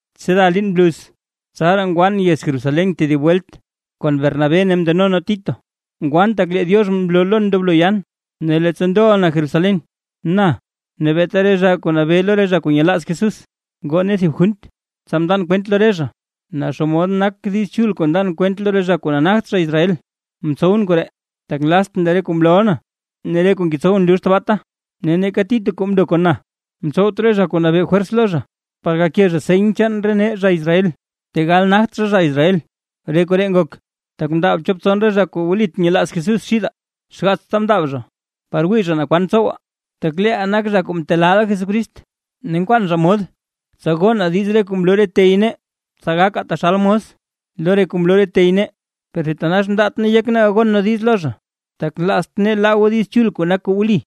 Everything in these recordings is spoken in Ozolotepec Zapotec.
Tseda liin bluz, tsaraa ngwan yez Jerusalén tedib welt kon Bernabé ne mndeno nee Tito. Ngwan tak lee Diox mloo lon ndoblo yan. Ne leettsa ndoʼa na Jerusalén, na ne beeta re zha kuu nabee lo re zha kuu nyelaaz Jesús ngoo nee thib junt, tsa mndan kwent lo re zha, naa xomod nak Diiz Chul kuu ndan kwent lo re zha kuu nagt zha Israel. Mtsowʼn koree, tak nlaztʼn lee re kuu mlooʼa na ne lee re kuu ngetsowʼn lux tabaata. Ne neeka Tito kuu mndo kon na, mtsowt re zha kuu nabee fwers lo zha, par gake zha seny chaan nee zha Israel, tegal nagt zha zha Israel. Re koree ngok, tak mndaab chop tson re zha kuu wlit nyelaaz Jesús xidaa, xgaatsta mndaab zha par wii zha naa kwan ntsowaa, tak leeʼaa nak zha kuu mtelaaʼa Jesucrist; ne nkwaan zha mod tsa gonaa diiz re kuu mloo re tey nee, tsa gakaa taxal mos lo re kuu mloo re tey nee. Per thitanax mndaat nee yek nee gagon nee diiz lo zha, tak nlaazt nee laa goo Diiz Chul, kuu nak kuu wli.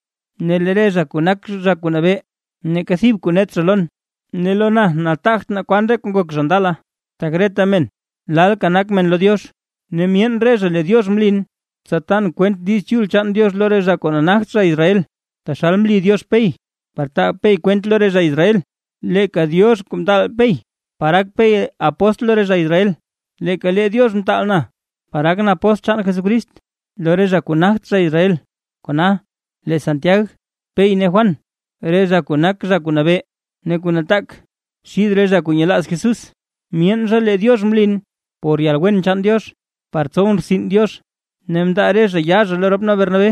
Ne lee re zha kuu nak zha kuu nabee, neeka thib kuu net zha lon. (Ne lo na nataagt naa kwan re kuu ngok zha ndala, tak reta men lalka nak men lo Diox.) Ne myeen re zha lee Diox mlin, tsa tan kwent Diiz Chul chaan Diox lo re zha kuu nagt zha Israel, taxal mli Diox Pey, par taa Pey kwent lo re zha Israel. Leeka Diox kuu mtaal Pey par gak Pey apóstl lo re zha Israel, leeka lee Diox mtaalʼn, par gakʼn apóstl chaan Jesucrist lo re zha kuu nagt zha Israel. Kona, lee Santiag, Pey ne Juan, re zha kuu nak zha kuu nabee ne kuu nataak xid re zha kuu nyelaaz Jesús, myeen zha lee Diox mlin por yalwen chaan Diox par tsowʼn rtsin Diox. Ne mndaa re zha yaa zha lo rop nee Bernabé,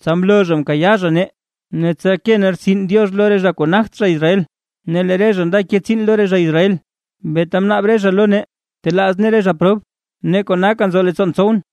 tsa mloo zha mkayaa zha nee; ne tsa ke nee rtsin Diox lo re zha kuu nagt zha Israel, ne lee re zha nda ke tsiin lo re zha Israel. Beeta mnaab re zha lo nee telaaz nee re zha prob, ne konaka nzo leettsoon tsowʼn.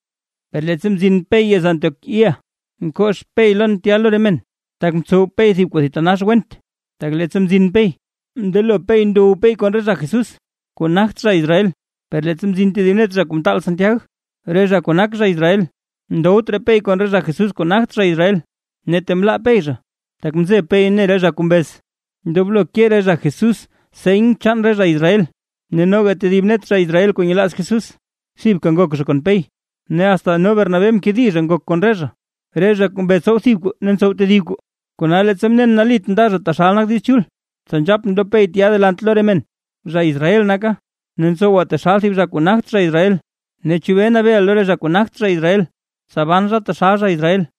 Per leettsa mzin Pey yez Antioquía, mkox Pey lon tya lo re men, tak mtsow Pey thib kuu thitanax went. Tak leettsa mzin Pey, mndelo Pey ndow Pey kon re zha Jesús kuu nagt zha Israel. Per leettsa mzin thib net zha kuu mtaal Santiag, re zha kuu nak zha Israel, ndowt raa Pey kon re zha Jesús kuu nagt zha Israel; ne tee mlaa Pey zha, tak mzeb Pey ne Pey re zha kuu mbez, ndoblo ke re zha Jesús seny chaan re zha Israel. Ne noga tedib net zha Israel kuu nyelaaz Jesús thibka ngok zha kon Pey, ne asta no Bernabé mkedi zha ngok kon re zha, re zha kuu mbez tsow thib kuu ne ntsow tedib kuu. Kona leettsa mnen nalit nda zha taxal nak Diiz Chul, tsa nzhapʼn lo Pey tya delant lo re men: “Zha Israel naka, ne ntsowa taxal thib zha kuu nagt zha Israel. Ne, ¿chebee nabeeʼa lo re zha kuu nagt zha Israel, tsa ban zha taxal zha Israel?”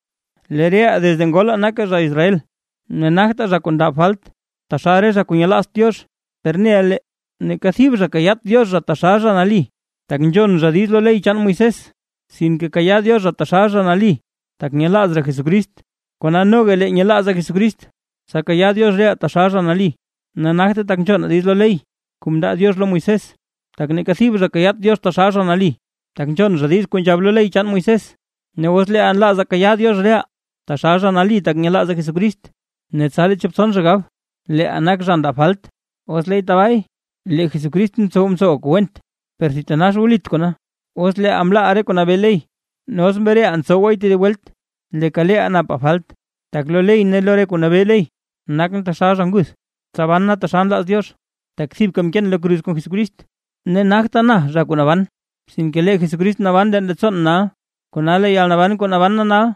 Lee reʼaa desde ngolaa nakaa zha Israel, ne nagtaa zha kuu ndab falt taxal re zha kuu nyelaazt Diox. Per neʼa lee, neeka thib zha kayaat Diox zha taxal zha nali, tak nzhon zha diiz lo ley chaan Moisés; sinke kayaa Diox zha taxal zha nali, tak nyelaaz zha Jesucrist. Kona noga lee nyelaazaa Jesucrist, tsa kayaa Diox reʼaa taxal zha nali. Ne nagte tak nzhonaa diiz lo ley kuu mndaa Diox lo Moisés, tak neeka thib zha kayaat Diox zha taxal zha nali, tak nzhon zha diiz kuu nzhab lo ley chaan Moisés. Ne os leeʼaa nlaazaa kayaa Diox reʼaa, taxal zha nali tak nyelaazaa Jesucrist, ne tsa lee chop tson gab, leeʼaa nak zha ndab falt. ¡Os leey tabaay, lee Jesucrist ntsow ntsowaa kuu went, per thitanax wlit kona! Os leeʼaa mlaaʼa lee re kuu nabee ley ne os mreʼaa ntsowaay tedib welt, leeka leeʼaa napaa falt. Tak lo ley ne lo re kuu nabee ley, nakʼn taxal zha nguth, tsa ban na taxal nlaaz Diox. Tak thibka mkeen lo kruz kon Jesucrist, ne nagta na zha kuu naban, sinke lee Jesucrist naban leen leettsoon nal. Kona lee yalnaban kuu naban na nal,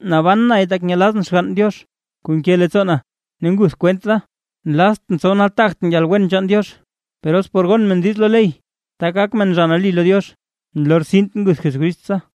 naban nay tak nyelazʼn Xgann Diox kuu nke leettsoo na ne nguth kwent da. Nlaztʼn tsow nataagtʼn yalwen chaan Diox; per os por gon men diiz lo ley, tak gak men zha nali lo Diox, nlortsint nguth Jesucrist tsa.